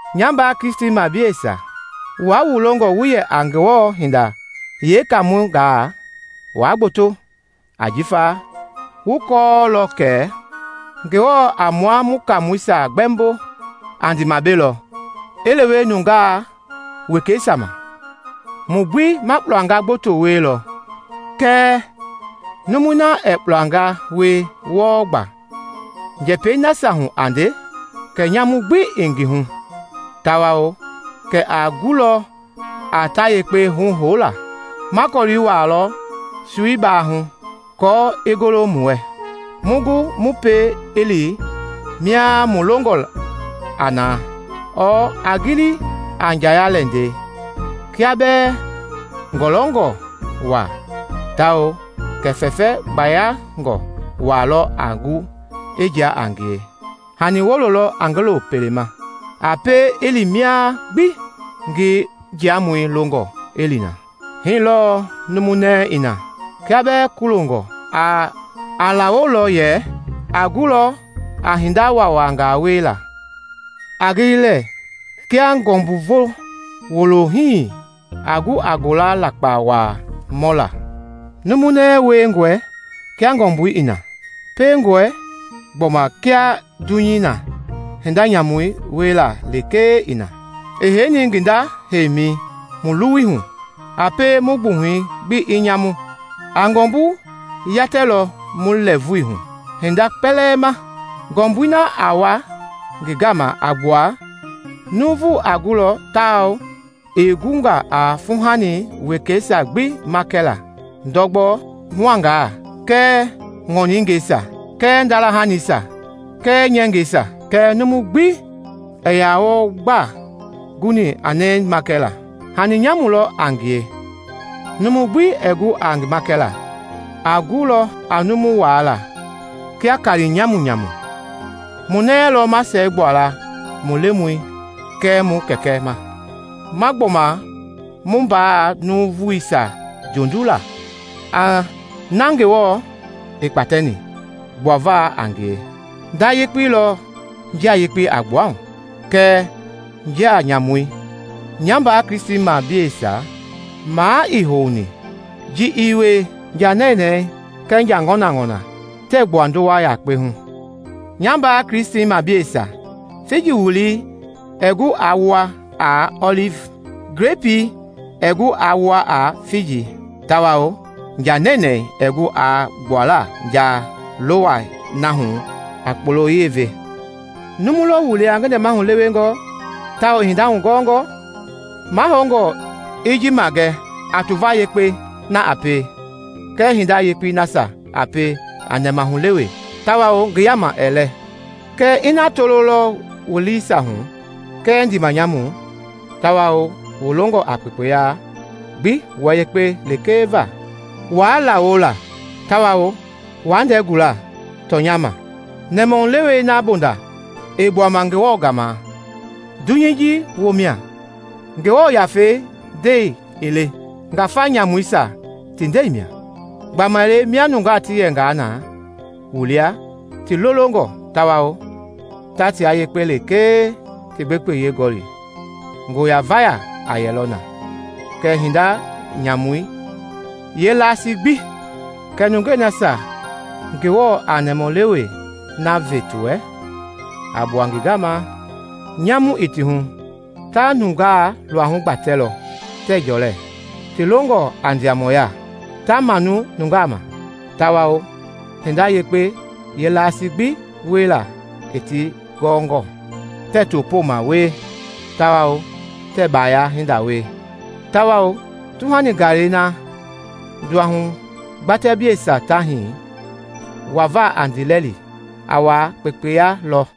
Nya mbaa Kristimableisia, wua wu longɔ wu yɛ a Ngewɔ hindei yeekaamɔngaa, waa gboto, ajifa wu kɔɔlɔ kɛ Ngewɔ a mua mu kaamɔisia gbɛmbo a ndiimabe lɔ i lewe nungaa wekeisia ma. Mu gbi ma kpulanga gboto wielɔ. Kɛɛ numui na ɛɛ kpulanga wie wɔɔ gba njɛpɛi nasia hu a nde, kɛ nyamu gbi ii ngi hu tawao kɛ a gulɔ a tayekpe huhoula. Ma kɔlii wuaalɔ soi baahu aako i golo mu wɛ, mu gu mu pie i li mia mu longɔ a na. Ɔɔ a gili a njaya-lɛndɛi: kia bɛɛ ngɔlɔngɔ waa tawao kɛ fɛfɛ gbayangɔ waa lɔ a gu i jia a ngie hani wulo lɔ a ngi lo pele ma, a pie i li mia gbi ngi njiamɔi longɔ i li na. Hii lɔɔ numu nɛi i na: kia bɛɛ kulongɔ, a lawolɔ yɛ a gulɔ a hinda waawanga wiela. A gili lɛɛ kia ngɔmbuvo wulohii a gu a ngola lakpa waa mɔla. Numu nɛi wiengɔe kia ngɔmbui i na. Piengɔe gbɔma kia dunyei na hinda nyamu wiela lekee i na, i heini ngi nda yɛmɛi mu luwui hu, a pie mu gbuhɛi gbi i nyamu. A ngɔmbu yatɛlɔ mu lɛɛvui hu hindei kpɛlɛɛ ma, ngɔmbui na a wa ngi gama a gbua jahama vulii. Nuuvu a gulɔ tawao i gunga a fuuhani wekeisia gbi makɛla, ndɔgbɔ-huangaa kɛɛ ŋɔningɛisia kɛɛ ndala-hanisia kɛɛ nyɛngɛisa. Kɛɛ numu gbi ii yaa wɔɔ gba guni a nɛi makɛla. Hani nyamu lɔ a ngie, numu gbi ɛɛ gu a ngi makɛla, a gu a numu waala kia kaali nyamunyamu. Mu nɛi lɔ ma siɛgbua la mu Lemɔi kɛɛ mu Kɛkɛ ma, ma gbɔma mu mbaa nuuvuisia jondu la, na Ngewɔ i kpatɛni gbuava a ngie. Nda yakpei lɔ njia yekpei a gbua hu kɛɛ njia nyamu. Nya mbaa Kristimableisia, maa ii houni ji i wie. Nja nɛnɛɛ kɛɛ nja ŋɔnaŋɔna tɛɛ gbua ndowa yakpei hu. Nya mbaa Kristimableisia, figi wulii ɛɛ gu aa wua a ɔlivi; glepii ɛɛ gu aa wua a figi, tawao nja nɛnɛɛ ɛɛ gu a gbuala njalowɛi na hu a kpolo-yɛi ve. Numu lɔ wu lia ngi nɛmahu lewengɔ tawao i hinda hugɔɔngɔ? Mahoungɔ i ji magɛ a tuva yekpei na a pie kɛɛ hinda yekpei nasia a pie a nɛmahulewe tawao ngi yaama ɛɛ lɛ. Kɛɛ ina toloi lɔ wu liisia hu kɛɛ ndiimanyamu tawao wu longɔ a kpekpeyei gbi wua yekpe lekee va, wuaa lawola tawao wa ndɛɛ gula tɔnyɛi ma. Nɛmahulewei na bonda ii gbuama Ngewɔ gama, dunyei ji woo mia, Ngewɔ Yafei ndɛi ii le, ngafa nyamuisia ti nde mia. Gbamaile mia nungaa ti yɛngaa na wu lia ti lolongɔ tawao ta tia yekpe lekee ti gbekpeyɛi gɔli, ngo-ya-vayei a yɛlɔ na kɛɛ hinda nyamui yeelasii gbi. Kɛɛ nungei nasia Ngewɔ a nɛmahulewei na ve ti wɛ a gbua ngi gama, nyamu ii ti hu, ta nungaa luahu gbatɛlɔ, tɛɛ jɔlɛ, ti longɔ a ndiamɔya; ta manu nungaa ma tawao hinda yekpei yeelasii gbi wiela i ti gɔɔngɔ; tɛɛ topooma wie tawao tɛɛ baaya hinda wie. Tawao tuhani gaalɛi na nduahugbatɛbleisia ta hii wava a ndiilɛli, a wa kpekpeya lɔ.